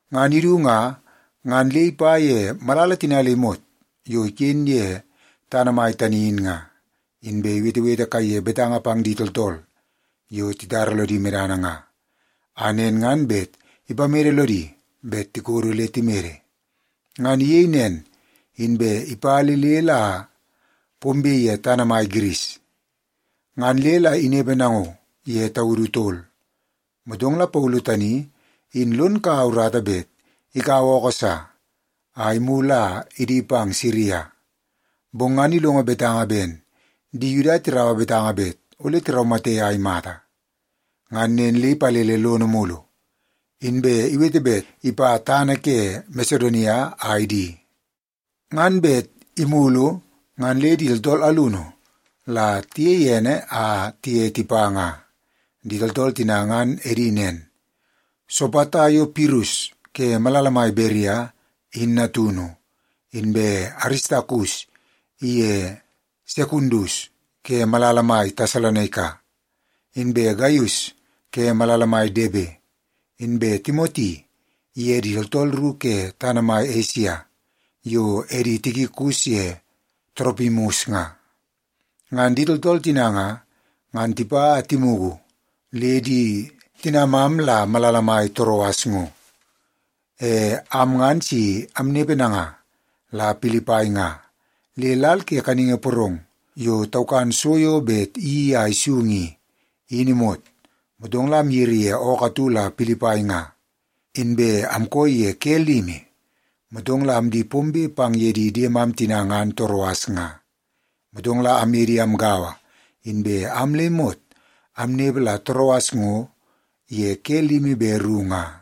Ngan idu nga, ngan le ipa ye malala tina le imot yo iken ye tana mai tani in nga, inbe iwetewete kaiye betanga pang di tooltool yo titara lodi medana nga, a nen ngan bet ipamede lodi bet tikodo le timede. Ngan iyei nen, inbe ipa le le la pombe ye tana mai Giris, ngan le la inepe nango ye taudu tol. Motong la Paulu tani in lon kaua urata bet ikaua ookoo sa a imulu a idi pang Siria. Bong ngan ilongo betanga ben di Yuda tiraua betanga bet ole tiraumate a imata. Ngan nen le ipalele lono mulu, inbe iwete bet ipa tana ke Masedonia a idi. Ngan bet imulu ngan le di tooltool alunu la tiyei ene a tiye tipa nga. Di tooltool tina ngan edi nen: Sopata yo Pirus ke malala mai Beria, in natunu; inbe Aristakus iye Sekundus ke malala mai Tesalonaika; inbe Gaius ke malala mai Debe; inbe Timoti iye di tooltool ru ke tana mai Esia, yo edi Tikikus ye Toropimus nga. Ngan di tooltool tina nga, ngan tipa a timugu le di tinamam la malala mai Toroas ngo. E am ngan si amnepe nanga la Pilipai nga, le lal ke kaningi porong yo taukan so yo bet iyeii a isung i, in imot, motong la amyiri ye ookoo atu la Pilipai nga. Inbe amkooi ye ke limi, motong la amdi pombe pang ye di diemam tina ngan Toroas nga. Motong la amye di amgaua, inbe am le imot amnepe la Toroas ngo ye ke limi be ru nga.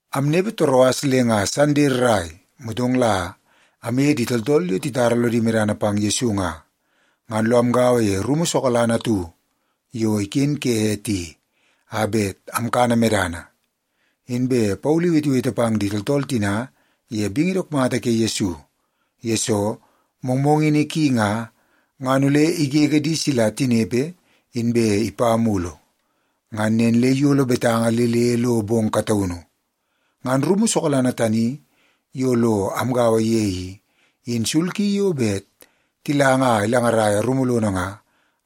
Amnepe Toroas le nga Sande rrai, motong la amye di tooltool yo titara lodi medana pang Yesu nga, ngan lo amgaua ye rumu sokalana atu yo iken ke ete i, a bet amkana medana. Inbe Paulu iwetewete pang di tooltool tina ye bingi dook mata ke Yesu, yesoo mongmongini ki nga, ngan ole igege di sila tinepe inbe ipa mulu. Ngan nen le iyolo betanga le le lo bong kataunu. Ngan rumu sokalana tani yo lo amgaua ye i, in sul ki yo bet tilanga a ilangaraia rumu lono nga,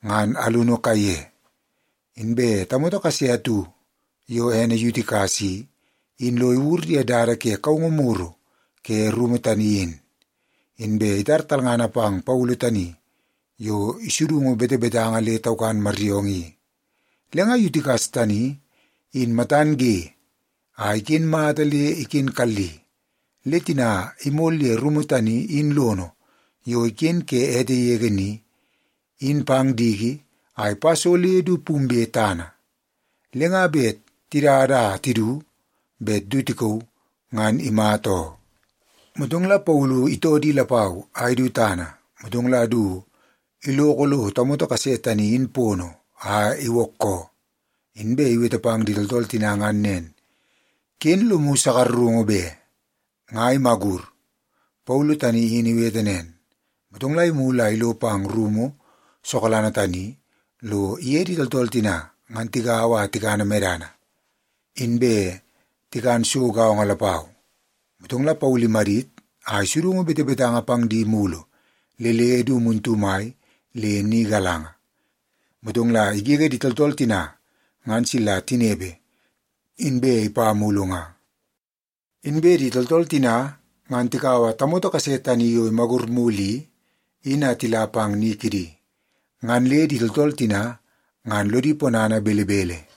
ngan alunu kaiye. Inbe tamoto kase atu yo ene Yutikas i, in lo iwur ye dada ke kaungu muru ke rumu tani in. Inbe itar talngana pang Paulu tani yo isudungu betebetanga le taukan maryoongoo i. Le nga Yutikas tani in matan ge a iken mata le iken kalli, le tina imol ye rumu tani in lono yo iken ke ete yege ni, in pang diki a ipa so le du pumbe tana, le nga bet tidada a tidu bet du tikauu, ngan imata oo. Motong la Paulu itoo di lapau a idu tana, motong la du iloko lo tamoto kase tani in pono a iwookoo. Inbe iwete pang di tooltool tina ngan nen, “Ken lomu sakarungu be. Nga imagur.” Paulu tani in iwete nen, motong la imulu a ilo pang ye rumu sokalana tani lo iye di tooltool tina ngan tigaua a tikana medana, inbe tikan so gaongo lapau. Motong la Paulu imadit a isudungu betebetanga pang di mulu le le du muntu mai le ni galanga, motong la igege di tooltool tina ngan sila tinepe, inbe ipa mulu nga. Inbe di tooltool tina ngan tikaua tamoto kase tani yo imagur mulu i, in a tila pang ni kidi. Ngan le di tooltool tina ngan lodi ponana belebele.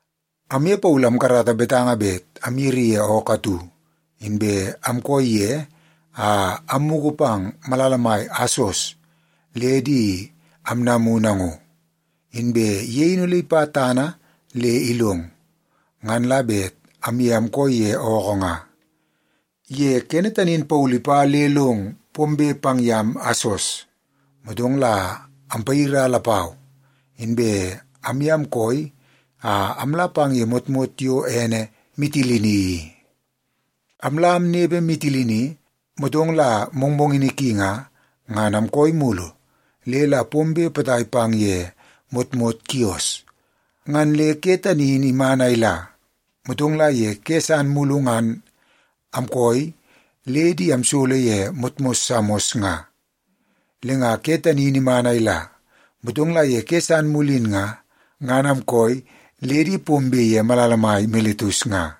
Amye Paulu amkarata betanga bet amyiri ye ookoo atu, inbe amkooi ye a ammugu pang malala mai Asos le di amnamu nango. Inbe ye in ole ipa tana le ilong, ngan la bet amye amkooi ye ookoo nga. Ye kene tani in Paulu ipa le long pombe pang yam Asos, motong la ampayira lapau, inbe amye amkooi a amla pang ye motmot yo ene Mitilini i. Amla amnepe Mitilini, motong la mongmongini ki nga, ngan amkooi mulu le la pombe potai pang ye motmot Kios. Ngan le ke tani in iman a ila, motong la ye ke san mulu ngan amkooi le di amsolo ye motmot Samos nga. Le nga ke tani in iman a ila, motong la ye ke san mulu in nga, ngan amkooi le di pombe ye malala mai Miletus nga.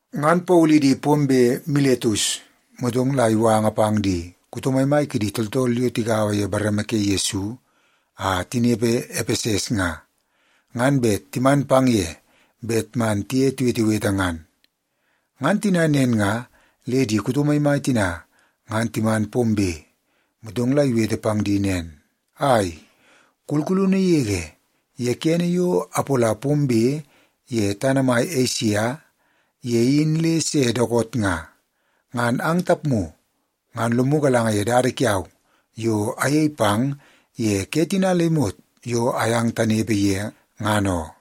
Ngan Paulu idi pombe Miletus, motong la iwanga pang di kuto maimai kidi tooltool yo tigaua ye bareme ke Yesu a tinepe Epeses nga, ngan bet timan pang ye bet man tiye tiwetewete ngan. Ngan tina nen nga, le di kuto maimai tina ngan timan pombe, motong la iwete pang di nen, “Ai, kulkulunu yege, ye kene yo apola pombe ye tana mai Esia ye in le se dookoot nga, ngan ang tapmu ngan lomu galanga ye dada kiau yo ayei pang ye ke tina le imot yo ayang tanepe ye, ngan oo.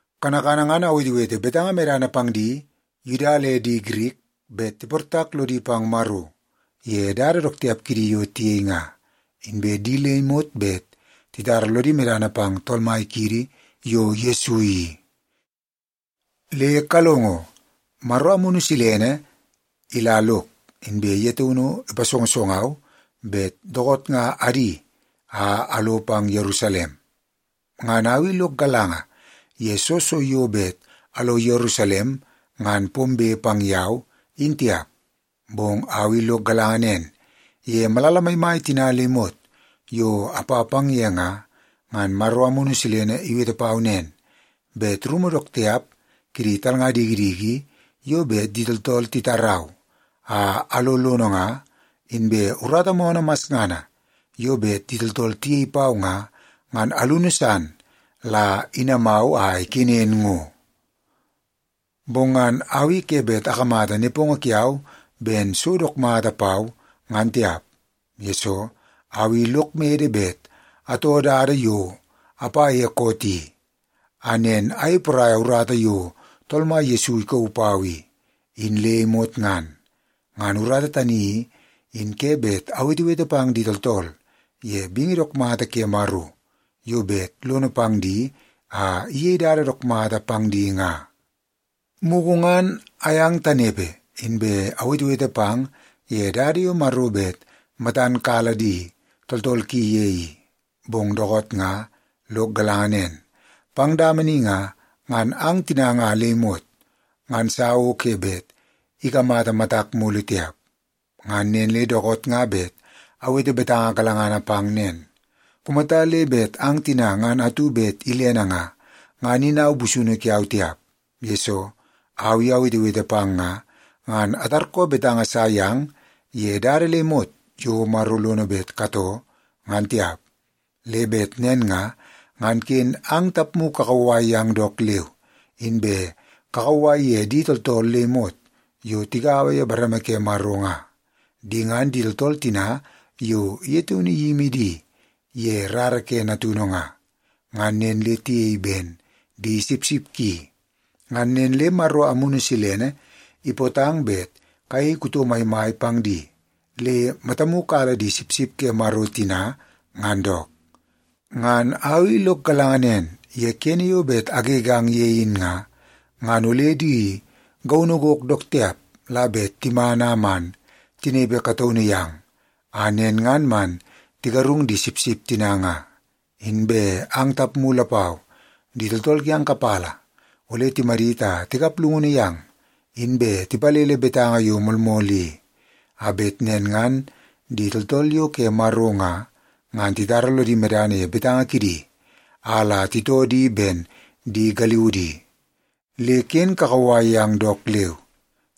Kanakana ngan awetewete betanga medana pang di Yuda le di Girik bet tiportak lodi pang Maro ye dada dook tiap kidi yo tiyei nga, inbe di le imot bet titara lodi medana pang Tool Mai kiidi yo Yesu i. “Le kalongo. Maro Amunu Silene ila lok, inbe ye taunu ipasongosongau bet dookoot nga adi a alo pang Yerusalem. Ngan au i lok galanga ye soo so yo bet alo Yerusalem ngan pombe pang yau, in tiap. Bong au i lok galanga nen, ye malala maimai tina le imot yo apa pang ye nga, ngan Maro Amunu Silene iwete pau nen, bet rumu dook tiap kidi talnga dikidiki yo bet di tooltool titarau a alo lono nga, inbe urata moonoo masngana yo bet di tooltool tiyei pau nga, ngan alunu san la inamau a ikenen ngo. Bong ngan au i ke bet akamata nepongo kiau ben so dook mata pau, ngan tiap. Yesoo, au i lok mede bet atoo dada yo apa ye koot i, a nen ayei poraia urata yo Tool Mai Yesu ikauu pau i, in le imot ngan. Ngan urata tani i, in ke bet awetewete pang di tooltool ye bingi dook mata ke Maro yo bet lono pang di a iyei dada dook mata pang di nga. “Mugu ngan ayang tanepe, inbe awetewete pang ye dada yo Maro bet matan kala di tooltool ki ye i. Bong dookoot nga lok galanga nen, pang dama ni nga, ngan ang tina nga le imot ngan sa o ke bet ikamata matak mulu tiap. Ngan nen le dookoot nga bet awete betanga galangana pang nen. Kumata le bet ang tina ngan atu bet ilene nga, ngan in au busunu kiau tiap, yesoo au i awetewete pang nga, ngan atarkoo betanga sa yang ye dada le imot yo Maro lono bet katoo, ngan tiap. Le bet nen nga, ngan ken ang tapmu kakauwai yang dook leu, inbe kakauwai ye di tooltool le imot yo tigaua ye bareme ke Maro nga. Di ngan di tooltool tina yo ye taunu iyimi di ye rara ke Natunu nga, ngan nen le tiyei ben di sipsip ki. Ngan nen le Maro Amunu Silene ipootang bet kayei kuto maimai pang di, le matamu kala di sipsip ke Maro tina ngan dook. Ngan au i lok galanga nen, ye kene yo bet agegang ye in nga, ngan ole di gaunu gok dook tiap la bet timan a man tinepe kataunu yang, a nen ngan man tigarung di sipsip tina nga. Inbe ang tapmu lapau, di tooltool kiang kapala ole timadit a tikap llungunu yang, inbe tipalele betanga yo moolmool i, a bet nen ngan di tooltool yo ke Maro nga, ngan titara lodi medana ye betanga kidi a la titoo di ben di galiudi. Le ken kakauwai yang dook leu!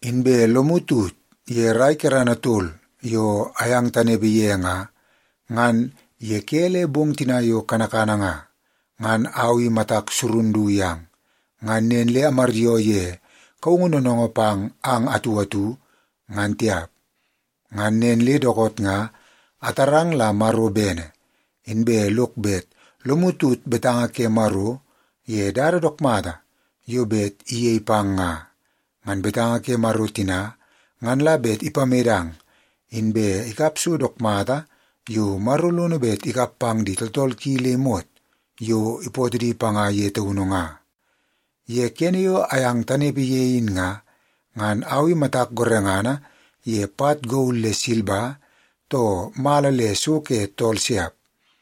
Inbe lomu tut ye rai kerana tol yo ayang tanepe ye nga, ngan ye ke le bong tina yo kanakana nga, ngan au i matak surun du yang, ngan nen le amaryoo ye kaungu noonoongoo pang ang atu atu, ngan tiap. “Ngan nen le dookoot nga, atarang la Maro bene, inbe lok bet lomu tut betanga ke Maro ye dada dook mata yo bet iyei pang nga. Ngan betanga ke Maro tina ngan la bet ipamedang, inbe ikap so dook mata yo Maro lono bet ikap pang di tooltool ki le imot yo ipootoo di panga ye taunu nga. Ye kene yo ayang tanepe ye in nga, ngan au i matak gorengana ye pat gol le silba, too mala le so ke tool siap.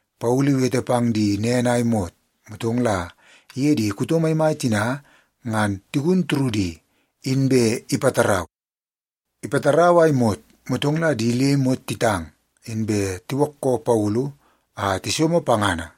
Paulu iwete pang di nen a imot, motong la iye di kuto maimai tina ngan tigun turudi, inbe ipatarau. Ipatarau a imot, motong la di le imot titang, inbe tiwookoo Paulu a tisomo pangana.